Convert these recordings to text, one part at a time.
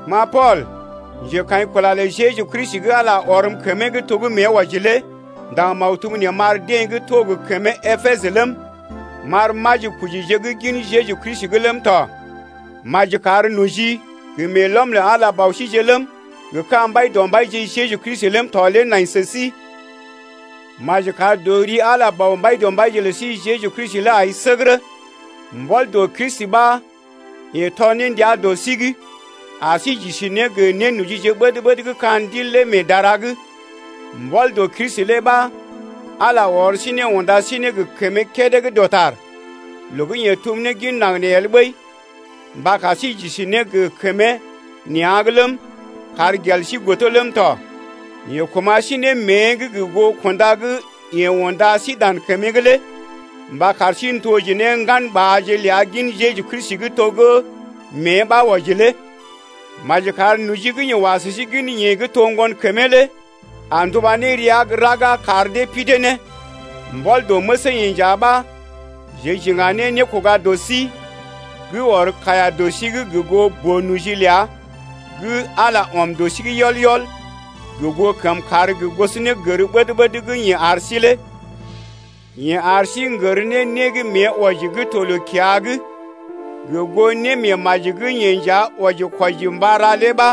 Ma Pool, njekaḭkula lə Jeju Kristi gə́ Ala ɔrm kəmee’g to gə́ mée wɔji lé m’ndaŋg maktub nee m’ar deḛ gə́ to gə kəmee Epesə ləm, m’ar majikojije gə́ gin Jeju Kristi ləm tɔ. Maji kar noji gə meelɔm lə Ala Bɔ síje ləm, gə ka̰ Mbaidɔmbaije Jeju Kristi ləm tɔ lé nai sə sí. Maji kar dɔ Ala Bɔ Mbaidɔmbaije lə sí Jeju Kristi lé ai səgərə, mbɔl dɔ Kristi ɓa yeḛ tɔr ne ndia dɔ sí’g ar sí j’isi ne gə nénojije ɓəd-ɓəd gə́ ka̰ Ndil lé mee dara’g. Mbɔl dɔ Kristi lé ɓa Ala ɔr sí ne unda sí ne gə kəmee kédé gə́ dɔtar, loo gə́ yeḛ tum ne gin naŋg nee el ɓəi, mba kar sí j’isi ne gə kəmee nea̰’g ləm, kar gel sí godo ləm tɔ. Yeḛ kuma̰ sí ne mée’g gə goo kunda gə́ yeḛ unda sí dan kəmee’g lé mba kar sí n’toje ne ŋganɓaaje ləa gin Jeju Kristi to gə́ mée ɓa wɔji lé. Maji kar noji gə́ yeḛ wa sə sí gin yeḛ gə́ to ŋgonkəmee lé a nduba ne rəa gə́ raga kar dee pidee ne. Mbɔl dɔ məsee-yeḛ nja ɓa jeḛ j’iŋga ne nékoga dɔ sí gə́ ɔr kaiya dɔ sí’g gə goo boo-noji ləa gə́ Ala ɔm ne dɔ sí’g yɔl-yɔl gə goo kəmkàr gə gosonégər ɓəd-ɓəd gə́ yeḛ ar sí lé. Yeḛ ar sí n’gər ne né gə́ mée wɔji gə́ to loo-kiya’g gə goo némeemaji gə́ yeḛ nja wɔji-kwɔji mba ra lé ɓa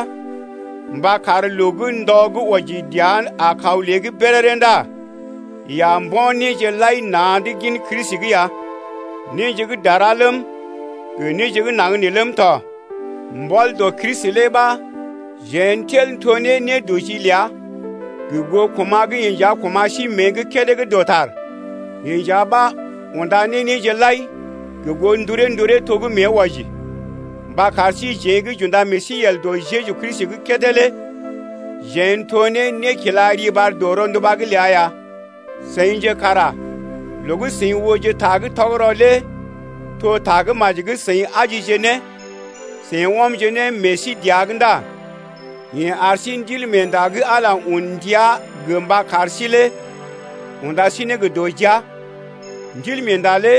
mba kar loo gə́ ndɔ gə́ wɔji dəa a kaw lée’g béréré ndá yeḛ a mbo̰ néje lai na̰’d gin Kristi’g ya, néje gə́ dara ləm, gə néje gə́ naŋg nee ləm tɔ, Mbɔl dɔ Kristi lé ɓa jeḛ n’tel n’to ne nédɔji ləa gə goo kuma̰ gə́ yeḛ nja kuma̰ sí mée’g kédé gə́ dɔtar, yeḛ nja ɓa unda ne néje lai gə goo nduree-nduree to gə́ mée wɔji mba kar síjeḛ gə́ j’unda meḛ sí yel dɔ Jeju Kristi’g kédé lé jeḛ n’to ne nékila riɓar dɔ rɔnduba’g ləa ya. Seḭje kara loo gə́ seḭ ooje ta gə́ tɔgərɔ lé to Tagə́maji gə́ seḭ ajije ne, seḭ ɔmje ne meḛ sí dəa’g ndá yeḛ ar sí Ndilmeenda gə́ Ala un ndia gə mba kar sí lé unda sí ne gə dɔ jia. Ndilmeenda lé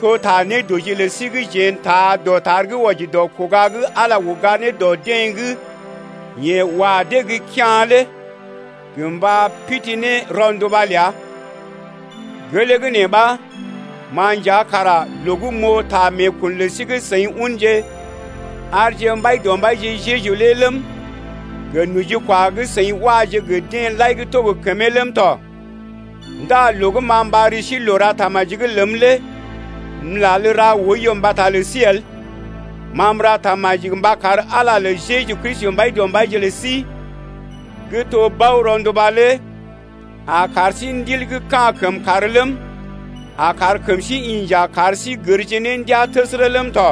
to ta nédɔji lə sí gə́ jeḛ n’taa dɔtar gə́ wɔji dɔ kuga gə́ Ala uga ne dɔ deḛ gə́ yeḛ wa dee gə́ kea̰ lé gə mba pidi ne rɔnduba ləa. Gelee gə́ nee ɓa ma nja kara loo gə́ m’oo ta meekun lə sí gə́ seḭ unje arje Mbaidɔmbaije Jeju lé ləm, gə nojikwa gə́ seḭ waje gə deḛ lai gə́ to gə kəmee ləm tɔ ndá loo gə́ ma m’ɓar ri sí loo ra tamaji ləm lé m’lal ra oiyo mbata lə sí el. Ma m’ra tamaji mba kar Ala lə Jeju Kristi, Mbaidɔmbaije lə sí gə́ to Bɔ rɔnduba lé a kar sí ndil gə́ ka̰ kəmkàr ləm, a kar kəm sí inja kar sí gərje ne ndiaa təsərə ləm tɔ.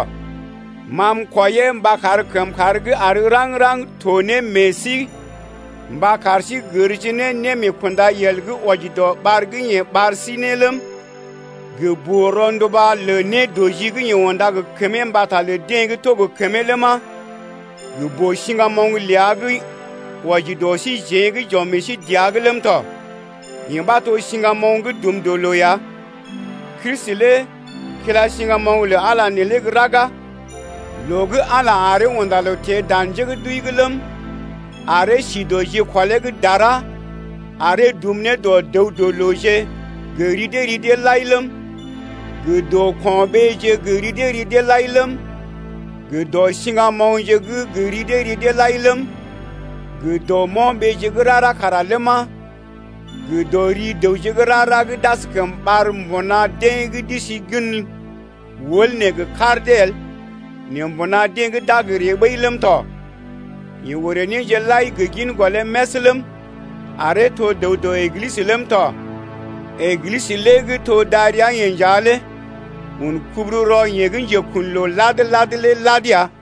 Ma m’kwɔiyee mba kar kəmkàr gə́ àr raŋg-raŋg to ne meḛ sí mba kar sí gərje ne némeekundayel gə́ wɔji dɔ ɓar gə́ yeḛ ɓar sí ne ləm, gə boo-ronduba lə nédɔji gə́ yeḛ unda gə kəmee mbata lə deḛ gə́ to gə kəmee ləma, gə boo-siŋgamoŋ ləa gə́ wɔji dɔ síjeḛ gə́ j’ɔm meḛ sí dəa’g ləm tɔ. Yee ɓa to siŋgamoŋ gə́ dum dɔ loo ya. Kristi lé kila siŋgamoŋ lə Ala neelé gə́ raga loo gə́ Ala aree unda loo teḛ dan njé gə́ d’wəi’g ləm, aree sí dɔ jikɔlee’g dara aree dum ne dɔ dəw-dɔ-looje gə ri dee ri dee lai ləm, gə dɔ ko̰ɓee gə ri dee ri deḛ lai ləm, gə dɔ siŋgamoŋje gə ri dee ri dee lai ləm, gə dɔ mo̰ɓee gə́ rara kara ləma, gə dɔ ri dəw gə́ rara gə́ d’askəm ɓar mbuna deḛ gə́ d’isi gən wəl neelé gə kar dee el nɛ mbuna deḛ gə́ d’a gə ree ɓəi ləm tɔ. Yeḛ orè néje lai gə gin gɔlee mès ləm, aree to dəw dɔ Eglisə ləm tɔ. Eglisə gə́ to darəa-yeḛ nja lé un kubururɔ yeḛ gə́ njekun loo lad-lad lé lad ya.